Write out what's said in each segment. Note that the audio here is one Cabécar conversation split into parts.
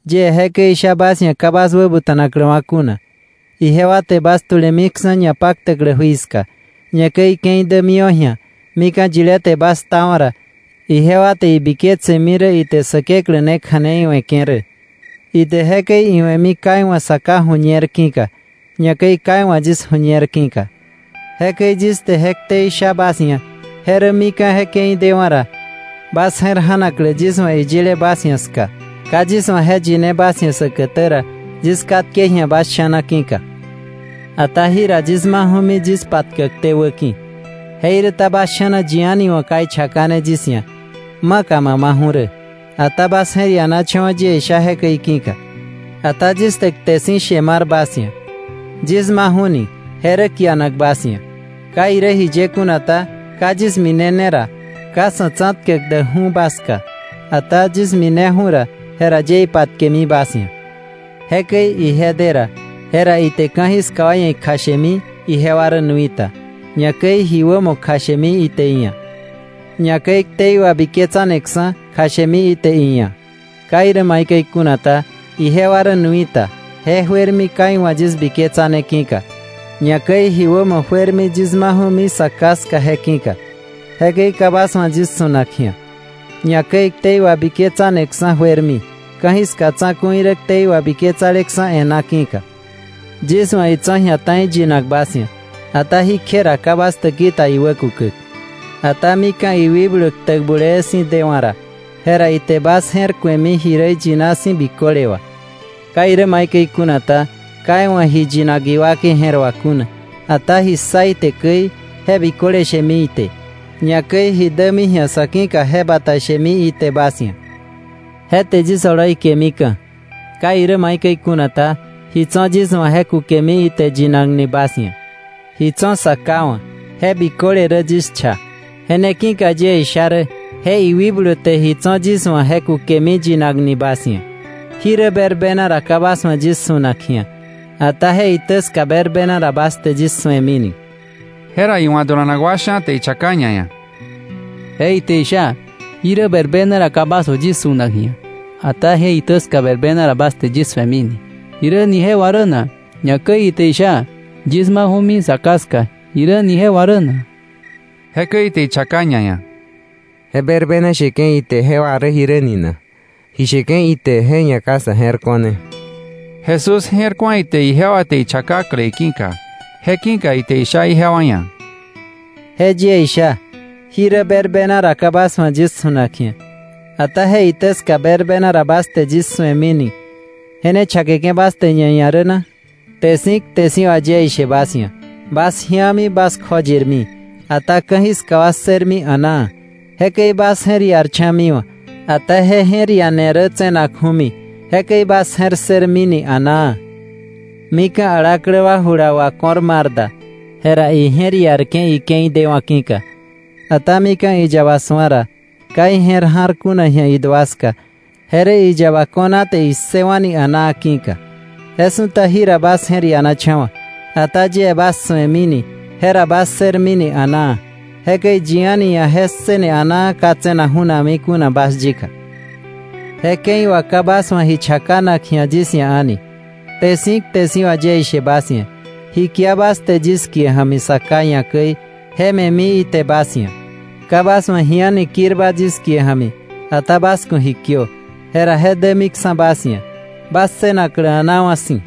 “Yie jekäi isha bas ia̱ ka bas wäbuta̱nakläwa̱ kuna. Ijewa te bas tulemiksa̱ ñapaktäklä jui ska, ñakäi ike̱i dämiwa̱ ji̱a mika̱ yilé te bas ktawa̱ ra, ijewa te ibiketsemi rä ite Säkeklä ne kja̱nei we̱ke̱ rä. Ite jekäi iwe̱mi ka iwa̱ Sa Ká ju̱ñer ki̱ka, ñakäi ka iwa̱ yis ju̱ñer ki̱ka. Jekäi yis te je ktei sha bas ia̱, je rä mika̱ je ke̱i dewa̱ ra, bas je̱r ja̱naklä yis wa̱ iyile bas ia̱ ska. “Ka yis wa̱ je yine bas ia̱ säkätä ra, yis katke ji̱a bas sha̱na ki̱ka. Ata jira yis maju̱mi yis patkäkté wäki̱. Jeiräta bas sha̱na yi a̱ni wa̱ ka ichakane yis ia̱: ‘¿Maka ma maju̱ rä?’ Ata bas je̱r ianacha̱wa̱ yie isha jekäi ki̱ka. Ata yis te kte si̱ she mar bas ia̱: Yis maju̱ni je rä kianak bas ia̱. Ka irä jiye kuna ta, ka yis minene ra, ka Sa̱ Tsa̱tkäk däkju̱ bas ska. Ata yis mineju̱ ra, jera yie ipatkemi bas ia̱. Jekäi ije de ra, jera ite ka̱jiska wa ia̱ ikjashemi ijewa rä nui ta, ñakäi ji wämo kjashemi ite iia̱, ñakäi ktei wabiketsaneksa̱ je kjashemi ite iia̱. Ka irä maikäi kuna ta, ijewa rä nui ta, je juermi ka iwa̱ yis biketsane ki̱ka. Ñakäi ji wämo juermi yis maju̱mi Sa Ká ska je ki̱ka, jekäi ka bas wa̱ yis su̱nak ji̱a. Ñakäi ktei wabiketsaneksa̱ juermi, ka̱jiska tsa̱ku̱i rä ktei wabiketsaleksa̱ e̱ná ki̱ka. “Yis wa̱ itso̱ ji̱a ta̱i yinak bas ia̱, ata jí kje ra ka bas täki ta iwä kukäk. Ata mika̱ iwikblu ktäk bulee si̱ dewa̱ ra, jera ite bas je̱r ku̱emi ji rä iyina si̱ biköle wà. Ka irä maikäi kuna ta, ka iwa̱ ji yinak iwakei je̱r wà kuna, ata ji ssa ite käi je biköle shemi ite, ñakäi ji dämi ji̱a sa̱ ki̱ka je bata shemi ite bas ia̱. Je te yis oloi kemika̱. Ka irä maikäi kuna ta, ji tso̱ yis wa̱ je kukemi ite yinakni bas ia̱. Ji tso̱ Sa Ká wa̱ je biköle rä yis cha. Je ne ki̱ka yie isha rä je iwikblu te ji tso̱ yis wa̱ je kukemi yinakni bas ia̱. “Jirä berbena ra ka bas wa̱ yis su̱nak ji̱a, ata je itä ska berbena ra bas te yis su̱emini.” Jera iwa̱ dulanak wa sha̱ te ichaka ñaia̱: —Je ite isha: ‘Jirä berbena ra ka bas wa̱ yis su̱nak ji̱a, ata je itä ska berbena ra bas te yis su̱emini’, ¿jiräni je wà rä na? Ñakäi ite isha: ‘Yis maju̱mi Sa Ká ska,’ ¿jiräni je wà rä na? Jekäi ite ichaka ñaia̱: —¿Je berbena sheke̱ ite je wà rä jiräni na? Ji sheke̱ ite je ia̱ ka sa̱ je̱r ko̱ne. Jesús je̱r ku̱a ite ijewa te ichakakle iki̱ka. Je ki̱ka ite isha ijewa ia̱: —Je yie isha: ‘Jirä berbena ra ka bas wa̱ yis su̱nak ji̱a, ata je itä ska berbena ra bas te yis su̱emini’, ¿je ne chakeke̱ bas te ñaia̱ rä na? Kte si̱ kte si̱ wà yie ishe bas ia̱, bas ji̱ami bas kjoyirmi, ata ka̱jiska wa ssërmi a̱naa. Jekäi bas je̱r iarcha̱miwa̱, ata je je̱r iane rä tse̱nakju̱mi, jekäi bas je̱r ssërmini a̱naa. Mika̱ alaklä wa jula wako̱r mar da, jera ije̱r iarke̱ ike̱i dewa̱ ki̱ka. Ata mika̱ iyaba su̱a ra, ka ije̱r ja̱r kuna ji̱a idua ska, je rä iyaba ko̱na te issëwa̱ni a̱naa ki̱ka. Je su̱ta jira bas je̱r ianacha̱wa̱, ata yie bas su̱emini, jera bas ssërmini a̱naa. Jekäi yi a̱ni ia̱ je ssëne a̱naa ka tse̱nak ju̱nami kuna bas yika.’ “Je ke̱i wà ka bas wa̱ ji chakanak ji̱a yis ia̱ a̱ni. Kte si̱ kte si̱ wà yie ishe bas ia̱, ji kia bas te yis kie ja̱mi Sa Ká ia̱ käi, je me̱mi ite bas ia̱. Ka bas wa̱ ji a̱ni kirba yis kie ja̱mi, ata bas ku̱ ji kiö, jera je dämiksa̱ bas ia̱, bas ssënaklä a̱naa wa̱ si̱.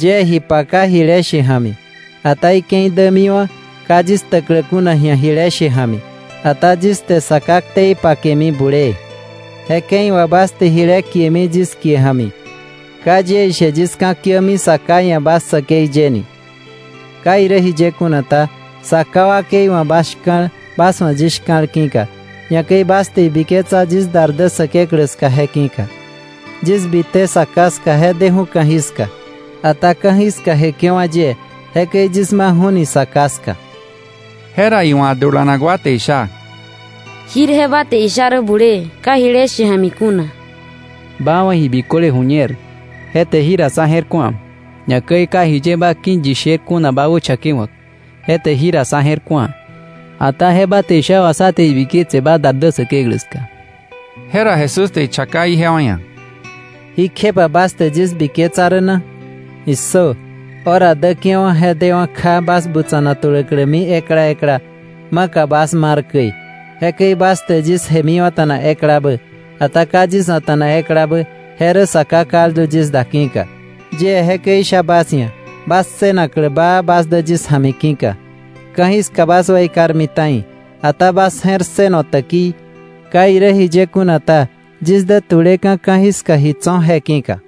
“Yie ji paka jile she ja̱mi, ata ike̱i dämiwa̱ ka yis ktäklä kuna ji̱a jile she ja̱mi, ata yis te Sa Ká ktei pakemi bulee. Je ke̱i wà bas te jile kiemi yis kie ja̱mi. Ka yie ishe yis ka̱kiämi Sa Ká ia̱ bas säkei ye ni. Ka irä jiye kuna ta, Sa Ká wakei wa̱ bas shka̱l bas wa̱ yis shka̱l ki̱ka, ñakäi bas te ibiketsa yis dar dä Säkeklä ska je ki̱ka. Yis bite Sa Ká ska je deju̱ ka̱jiska, ata ka̱jiska jeke̱wa̱ yie, jekäi yis maju̱ni Sa Ká ska.” Jera iwa̱ dulanak wa te isha: —Jirje ba te isha rä bulee ka jile she ja̱mi kuna. Ba wa̱ ji biköle ju̱ñer, je te jira sá je̱r ku̱a. Ñakäi ka jiye ba ki̱ yi sher kuna ba wächakewa̱k, je te jira sá je̱r ku̱a. Ata je ba te isha wà sá te ibiketse ba dar dä Säkeklä ska. Jera Jesús te ichaka ijewa ia̱: —¿Jí kjepa bas te yis biketsa rä na? ¡Issö! Hora däke̱wa̱ je dewa̱ kja bas butsa̱na tuläklämi ekla ekla, maka bas mar käi. Jekäi bas te yis jemiwa̱ta̱na eklabä, ata ka yis a̱ta̱nak eklabä, je rä Sa Ká kaldu yis da ki̱ka. Yie jekäi isha bas ia̱ bas ssënaklä baa bas dä yis ja̱mi ki̱ka. Ka̱jiska bas weikarmi ta̱i, ata bas je̱r ssëno täkii. Ka irä jiye kuna ta, yis dä tu̱leka̱ ka̱jiska ji tso̱ je ki̱ka.